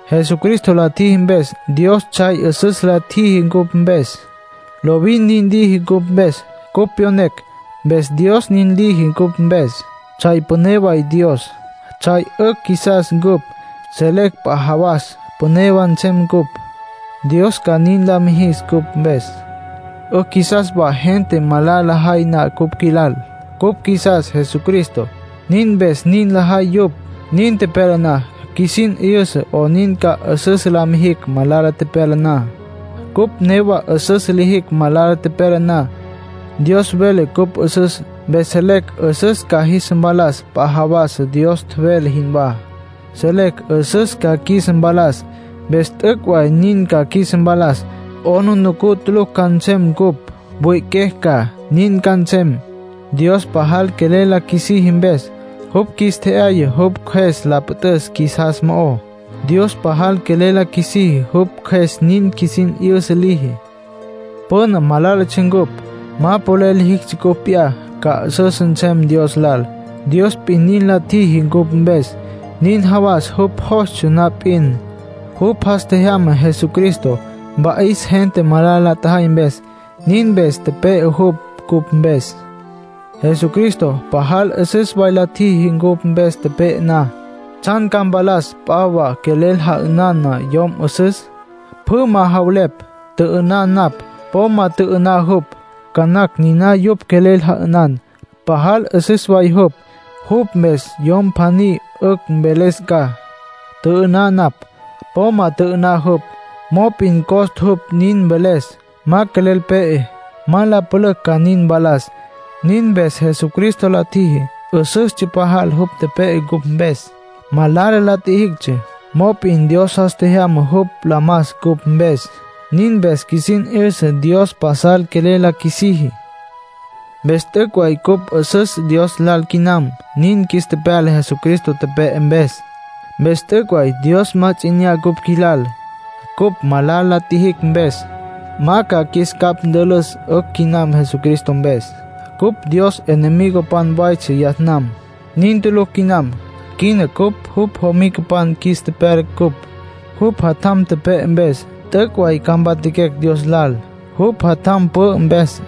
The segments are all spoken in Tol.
Jesucristo la tjiji mpes, Dios tsjay 'üsüs la tjiji cupj mpes. Lovin nin liji cupj mpes. Cupj tepyonecj, mpes Dios nin liji cupj mpes. Tsjay püné way Dios. Tsjay 'ücj qjuisas cupj; selecj p'a jawas püné wa nsem cupj, Dios ca nin la mijis cupj mpes. 'Ücj qjuisas wa gente malala lajay na cupj qjuilal. Cupj qjuisas Jesucristo, nin mpes nin lajay yupj. Nin tepyala na, qjuisin 'yüsa 'onin ca 'üsüs la mijicj malala pyala na. Cupj newa 'üsüs lijicj malala tepyala na, Dios vele cupj 'üsüs. Dios vele cupj 'üsüs, mpes selecj 'üsüs ca qjuis mpalas p'a jawas, Dios tjevele jinwá. Selecj 'üsüs ca qjuis mpalas. Mpes t'üc' way nin ca qjuis mpalas. 'Aplijila tulucj ca nsem cupj. Mwi'iquecj ca. Nin ca nsem, Dios pajal quelel la qjuisiji mpes. Jupj qjuis tje'yaya jupj Cjües la püt'üs qjuisas mo'ó. Dios pajal quelel la qjuisiji, jupj Cjües nin qjuisin 'yüsa liji. Püna malálatsja cupj. Ma polel lijictsja cupj p'iyá ca 'üsüs nsem Dios lal. Dios p'in nin la tjiji cupj mpes. Nin jawas jupj jostsja na p'in, jupj jas tjejyama Jesucristo, mpa'is gente malala la tjajay mpes. Nin mpes tepe'e jupj cupj mpes. Jesucristo pajal 'üsüs way la tjiji, cupj mpes tepe'e na. ¿Tsjan ca mpalas p'a wa quelel ja'ünan na yom 'üsüs? Pjü ma javelepj: “Tjü'ü'ná napj, po ma tjü'ü'ná jupj”. Ca nacj niná yupj quelel ja'ünan, pajal 'üsüs way jupj. Jupj mpes yom pjaní 'ücj mveles ca: “Tjü'ü'ná napj, po ma tjü'ü'ná jupj.” Mop'in costa jupj nin mveles; ma quelel pe'e. Ma la pülücj ca nin mpalas. Nin mpes Jesucristo la tjiji, 'üsüstsja pajal. Jupj tepe'e cupj mpes. Malala la tjijictsja; mop'in Dios jas tjejyama jupj la mas cupj mpes. Nin mpes qjuisin 'yüsa Dios pasal quelel la qjuisiji. Mpes t'üc' way cupj 'üsüs Dios lal quinam, nin qjuis tepyala Jesucristo tepe'e mpes. Mpes t'üc' way Dios ma ts'i 'inyá cupj qjuis lal, cupj malala la tjijicj mpes. Ma ca qjuis capj ntülüs. 'Ücj quinam Jesucristo mpes. Cupj Dios enemigopan waytsja yas nam; nin tulucj quinam. Quina cupj jupj jomicapan qjuis tepyala cupj, jupj Jatjam tepe'e mpes. T'üc' way ca mpatjaquecj Dios lal, jupj Jatjam pü'ü mpes.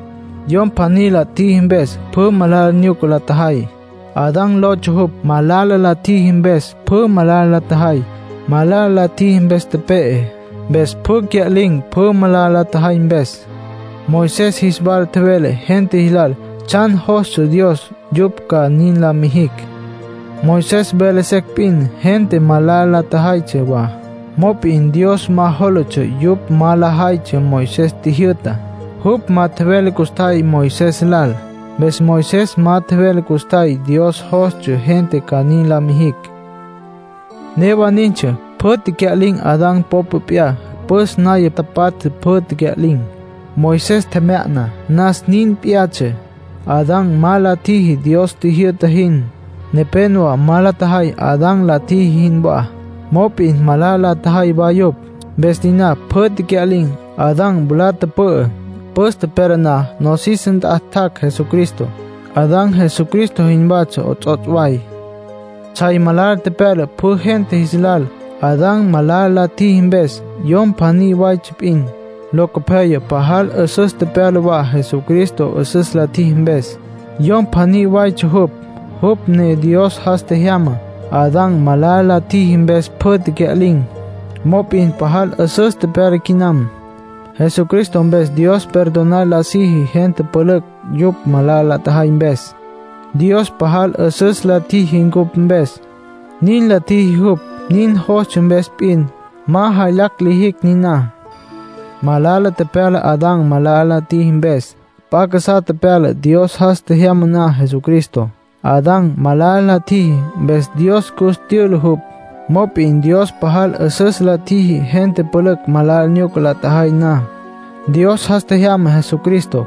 Yom pjaní la tjiji mpes pjü malala nyuca la tjajay. Adán lotsja jupj. Malala la tjiji, mpes pjü malala lajay. Malala la tjiji, mpes tepe'e. Mpes pjü cya'lin̈, pjü malala la tjajay mpes. Moisés jis wala tjevele gente jis lal tsjan jostsja Dios yupj ca nin la mijicj. Moisés vele secj p'in, gente malala la tjajaytsja wa. Mop'in Dios ma jólatsja yupj ma lajaytsja Moisés tjijyü'tá; jupj ma tjevele custjay Moisés lal, mpes Moisés ma tjevele custjay Dios jostsja gente ca nin la mijicj. Newa nintsja; pjü tecya'lin̈. Adán popa p'iyá püs naya tapatja pjü tecya'lin̈. Moisés tjemya'na nas, nin p'iyatsja. Adán ma la tjiji Dios tjijyü'ta jin. Nepénowa ma la tjajay Adán la tjiji jinwá, mop'in malala la tjajay wa yupj. Mpes niná pjü tecya'lin̈. Adán mwalá tüpü'ü. Püs tepyala na nosis nt'a tjac' Jesucristo. Adán Jesucristo jinwatsja 'ots'ots' way. Tsjay malala tepyala pjü gente jis lal, Adán malala la tjiji mpes. Yom pjaní waytsja p'in. Locopyaya pajal 'üsüs tepyala wa Jesucristo 'üsüs la tjiji mpes. Yom pjaní waytsja jupj, jupj ne Dios jas tjejyamá. Adán malala la tjiji, mpes pjü cya'lin̈. Mop'in pajal 'üsüs tepyala quinam. Jesucristo mpes Dios perdonar la siji gente pülücj, yupj malala la tjajay mpes. Dios pajal 'üsüs la tjiji cupj mpes. Nin la tjiji jupj nin jostsja mpes p'in. Ma jaylacj lijicj niná. Malala tepyala Adán malala la tjiji mpes. P'a casá tepyala Dios jas tjejyama na Jesucristo. Adán malala la tjiji, mpes Dios cus tyüla jupj. Mop'in Dios pajal 'üsüs la tjiji. Gente pülücj malala nyuca la tjajay na, Dios jas tjejyama Jesucristo.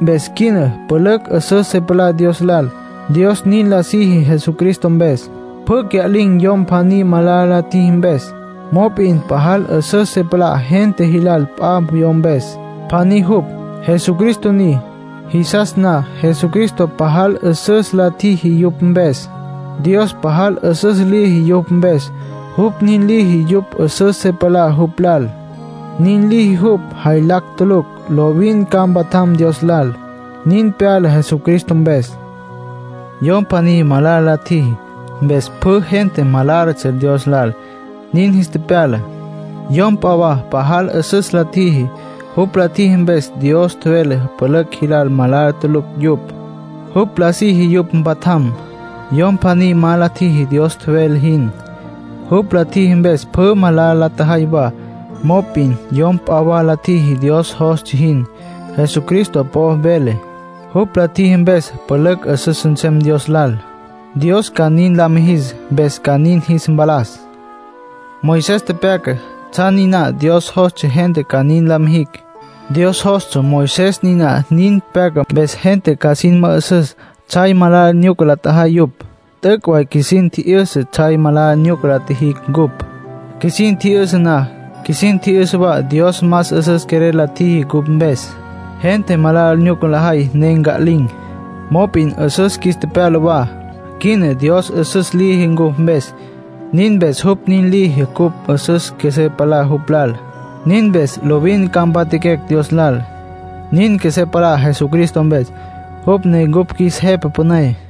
Mpes quina pülücj 'üsüs se palá Dios lal, Dios nin la siji Jesucristo mpes. Pjü cya'lin̈, yom pjaní malala la tjiji mpes. Mop'in pajal 'üsüs se palá gente jilal p'a yom mpes. Pjaní jupj, Jesucristo ni. Jisas na Jesucristo pajal 'üsüs la tjiji yupj mpes, Dios pajal 'üsüs liji yupj mpes. Jupj nin liji yupj 'üsüs se palá jupj lal. Nin liji jupj, jaylacj tulucj. Lovin ca mpatjam Dios lal. Nin pyala Jesucristo mpes. Yom pjaní malala la tjiji, mpes pjü gente malálatsja Dios lal, nin jis tepyala. Yom p'a wa pajal 'üsüs la tjiji. Jupj la tjiji mpes, Dios vele pülücj jilal malala tulucj yupj. Jupj la siji yupj mpatjam. Yom pjaní ma la tjiji Dios tjevele jin. Jupj la tjiji mpes, pjü malala la tjajay wa. Mop'in yom p'a wa la tjiji Dios jostsja jin; Jesucristo po'o velé. Jupj la tjiji mpes pülücj 'üsüs nsem Dios lal; Dios ca nin lis mijis mpes ca nin jis mpalas. Moisés tepyaca tsjan niná Dios jostsja gente ca nin la mijicj. Dios jostsja Moisés niná nin pyaca, mpes gente ca sin mü'üsüs tsjay malala nyuca la tjajay yupj. T'üc' way qjuisin tji'yüsa tsjay malala nyuca la tjijicj cupj. Qjuisin tji'yüsa na, qjuisin tji'yüsa wa Dios más 'üsüs quelel la tjiji cupj mpes. Gente malala nyuca lajay, ne cya'lin̈. Mop'in 'üsüs qjuis tepyala wa. Quina Dios 'üsüs liji cupj mpes. Nin mpes jupj nin liji cupj 'üsüs qjuesé palá jupj lal. Nin mpes lovin ca mpatjaquecj Dios lal. Nin qjuesé palá Jesucristo mpes, jupj ne cupj qjuis Jepa Püné.